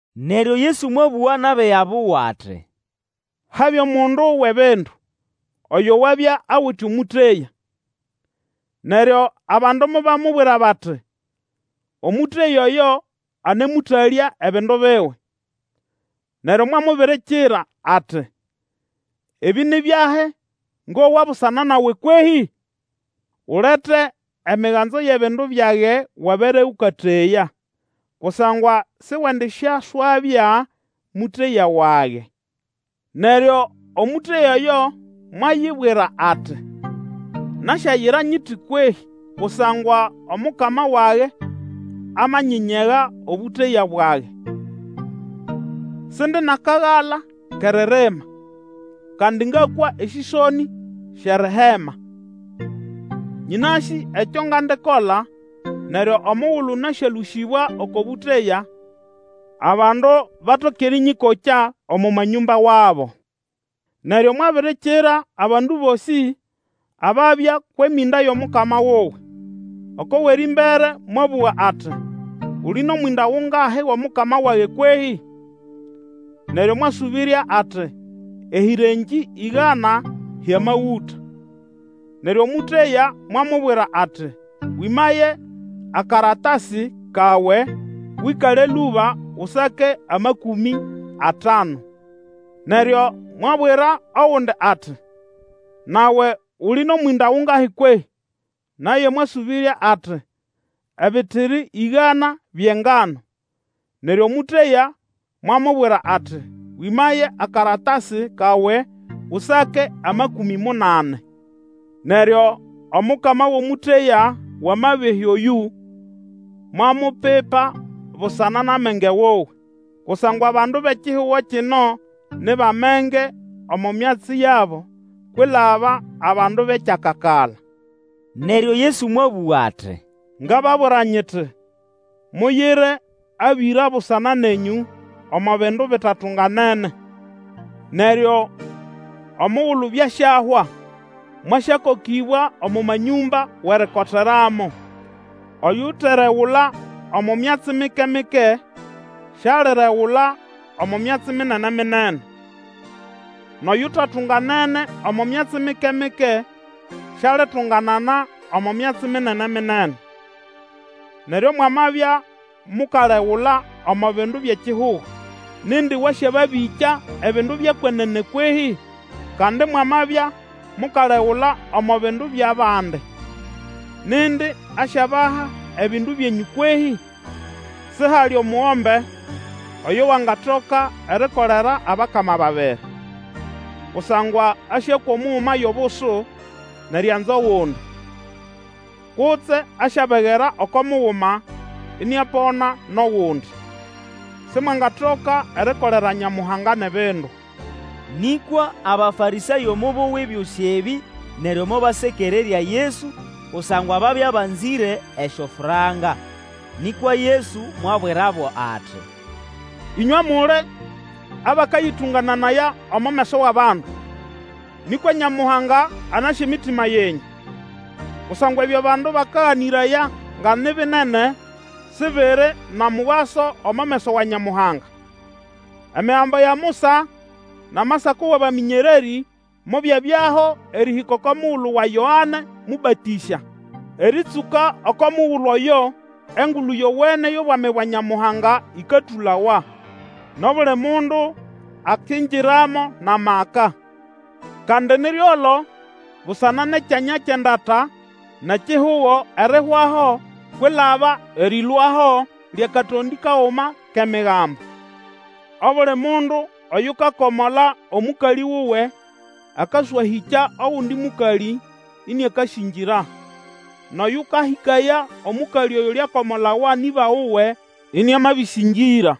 Neryo Yesu mwabũga nʼabiga buwe ati, Habya omundu wʼebindu oyo wabya awite omũteya. Neryo abandu mobamubwira bati omũteya oyo anemũtalya ebindu biwe. Neryo mwamubirikira ati, Ebĩ nĩ byahi ngowa busana nawe kwehĩ? Ulete emiganzo yʼebindu byage Wabere ũkateya, kusangwa siwendisyaswabya mũteya wage. Neryo omũteya oyo mwayibwira ati, Nasyayira nyiti kwehĩ, kusangwa omukama wage amanyinyega obũteya bwage. Sindi nʼakagala kʼeririma, kandi ngakwa esĩsonĩ syʼerihema. Nyĩnasĩ ekyo ngandikola, neryo omugulu nasyalũsĩbwa oko bũteya, abandu batoke erĩnyĩkokya omo manyũmba wabo. Neryo mwabirikira abandu bosĩ ababya kwʼemĩnda yʼomukama wuwe. Oko wʼerĩmbere mwabũga ati, Uli nʼomwĩnda gungahi gʼomukama wage kwehĩ? Neryo mwasũbĩrya ati, Ehĩrengĩ ĩgana hyʼamagũta. Neryo omũteya mwamubwira ati, Wĩmaye akaratasi kawe, Wĩkale lũba Usake amakũmĩ atanu. Neryo mwabwira ogundi ati, Nawe uli nʼomwĩnda gungahi kwehĩ? Naye mwasũbĩrya ati, Ebitiri ĩgana byʼengano. Neryo omũteya mwamubwira ati, Wĩmaye akaratasi kawe Usake amakũmĩ munani. Neryo omukama wʼomũteya wʼamabehĩ oyũ mwamupipa busana nʼamenge wuwe; kusangwa bandu bʼekihugo kino ni bʼamenge omo myatsi yabo kwilaba abandu bʼekyakakala. Neryo Yesu mwabũga ati, Ngababwira nyiti, muyire abĩra busana nenyũ omo bindu bitatunganene, neryo omugulu byasyahwa, mwasyakokĩbwa omo manyũmba wʼerikoteramo. Oyuteregula omo myatsi mike-mike sialiregula omo myatsi minene-minene; nʼoyutatunganene omo myatsi mike-mike, sialitunganana omo myatsi minene-minene. Neryo mwamabya mukalegula omo bindu byʼekihugo, nindi wasyababĩkya ebindu byʼekwenene kwehĩ? Kandi mwamabya mukalegula omo bindu byʼabandi, nindi asyabaha ebindu byenyũ kwehĩ? Sihali omugombe oyo wangatoka erikolera abakama babiri; kusangwa asyakwa omuguma yʼobusu, nʼerianza ogundi; kutse asyabegera oko muguma, iniapona nʼogundi. Simwangatoka erikolera Nyamuhanga nʼebindu. Nĩkwa Abafarĩsayo mobowa ebyosĩ ebĩ neryo mobasekererya Yesu, kusangwa babya banzĩre esyofranka. Nĩkwa Yesu mwabwirabo ati, Ĩnywe muli abakayĩtũngananaya omo meso wʼabandu, nĩkwa Nyamuhanga anasĩ emitima yenyũ. Kusangwa ebyo abandu bakaganĩraya nga ni binene, Sibiri na mugaso omo meso wa Nyamuhanga. Emigambo ya Musa nʼAmasako wʼabamĩnyererĩ mobyabyaho erĩhĩka oko mugulu wa Yoane Mũbatĩsya; erĩtsũka oko mugulu oyo Engulu Yowene yʼobwami bwa Nyamuhanga ĩkatũlawa, nʼobuli mundu akingiramo nʼamaka. Kandi ni ryolo busana nʼekyanya kyʼendata nʼekihugo erihwaho kwilaba erĩlũaho lyʼakatondĩ kaguma kʼEmigambo. Obuli mundu oyukakomola omũkalĩ wuwe akaswahĩkya ogundi mũkalĩ ĩniakasĩngĩra, nʼoyũkahĩkaya omũkalĩ oyuliakomolawa nʼĩba wuwe, ĩnĩamabĩsĩngĩra.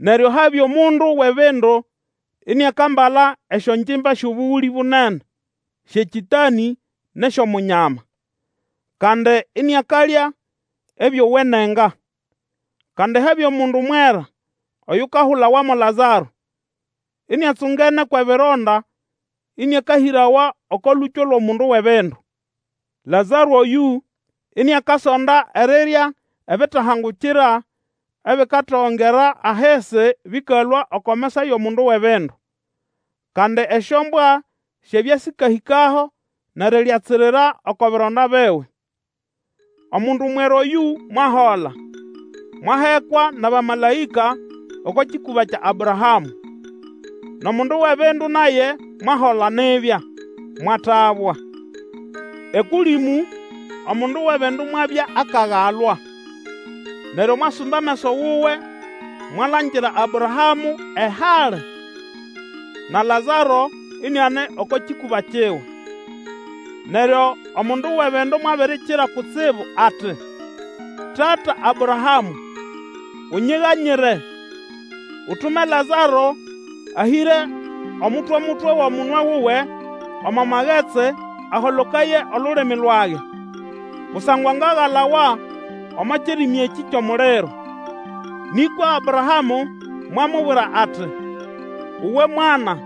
Neryo habya omundu wʼebindu iniakambala esyongimba syʼobũgũlĩ bunene syʼekĩtanĩ nʼesyʼomunyama. Kandi iniakalya ebyowenenga. Kandi habya nʼomundu mwera oyukahulawa mo Lazaro iniatsungene kwʼebironda, ĩnĩakahĩrawa oko lũkyo lwʼomundu wʼebindu. Lazaro oyũ iniakasonda erirya ebitahangukira ebikatogongera ahisi bĩkalũa oko mesa yʼomundu wʼebindu; kandi esyombwa syabya sĩkahĩkaho nʼeriryatsirira oko bironda biwe. Omundu mwera oyũ mwahola, mwahekwa nʼabamalaĩka oko kĩkũba kya Abrahamũ; nʼomundu wʼebindu naye mwahola nibya, mwatabwa. Ekũlĩmũ omundu wʼebindu mwabya akagalwa, neryo mwasumba ameso wuwe mwalangira Abrahamũ ehali, na Lazaro iniane oko kĩkũba kiwe. Neryo omundu wʼebindu mwabirikira kutsibu ati, Tata Abrahamũ! unyiganyire, Utume Lazaro ahĩre omutwe-mutwe wʼomunwe wuwe omo magetsi aholokaye olulimi lwage, kusangwa ngagalawa omo kirimi ekĩ kyʼomuliro. Nĩkwa Abrahamũ mwamubwira ati, Uwe mwana,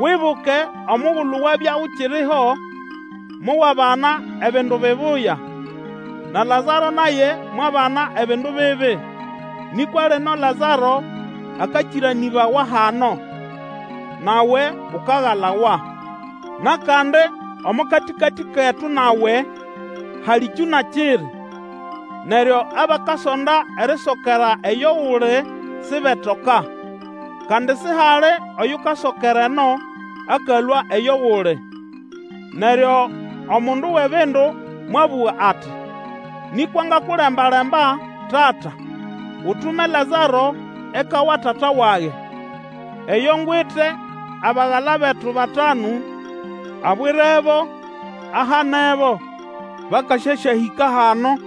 Wibuke omugulu wabya ukiriho mowabana ebindu bibuya, na Lazaro naye mwabana ebindu bibi; nĩkwa lino Lazaro akakĩranĩbawa hano, nawe ukagalawa. Nʼakandi omo katĩkatĩ ketu nawe, hali kyũna kiri, neryo abakasonda erisokera eyo uli sibetoka, kandi sihali oyukasokera eno akalũa eyo uli. Neryo omundu wʼebindu mwabũga ati, Nĩkwa ngakulembalemba Tata, Utume Lazaro eka wa tata wage, eyo ngwite abagala betu batanu, abwirebo ahanebo, bakasyasyahĩka hano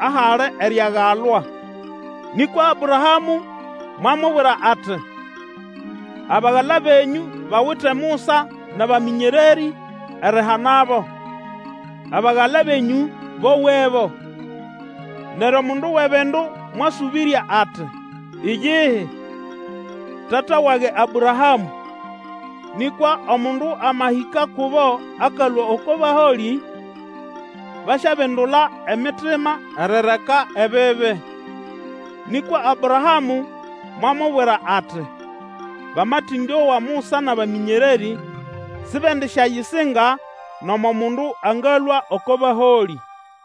ahali eriagalwa. Nĩkwa Abrahamũ mwamubwira ati, Abagala benyũ bawite Musa nʼabamĩnyererĩ erihanabo; abagala benyũ bowebo. Neryo omundu wʼebindu mwasũbĩrya ati, Iyihi, tata wage Abrahamũ! Nĩkwa omundu amahĩka kubo akalũa oko baholĩ, basyabindula emitima erireka ebibi. Nĩkwa Abrahamũ mwamubwira ati, Bamatĩndowa Musa nʼabamĩnyererĩ, sibendisyayisinga nomo mundu angalũa oko baholĩ.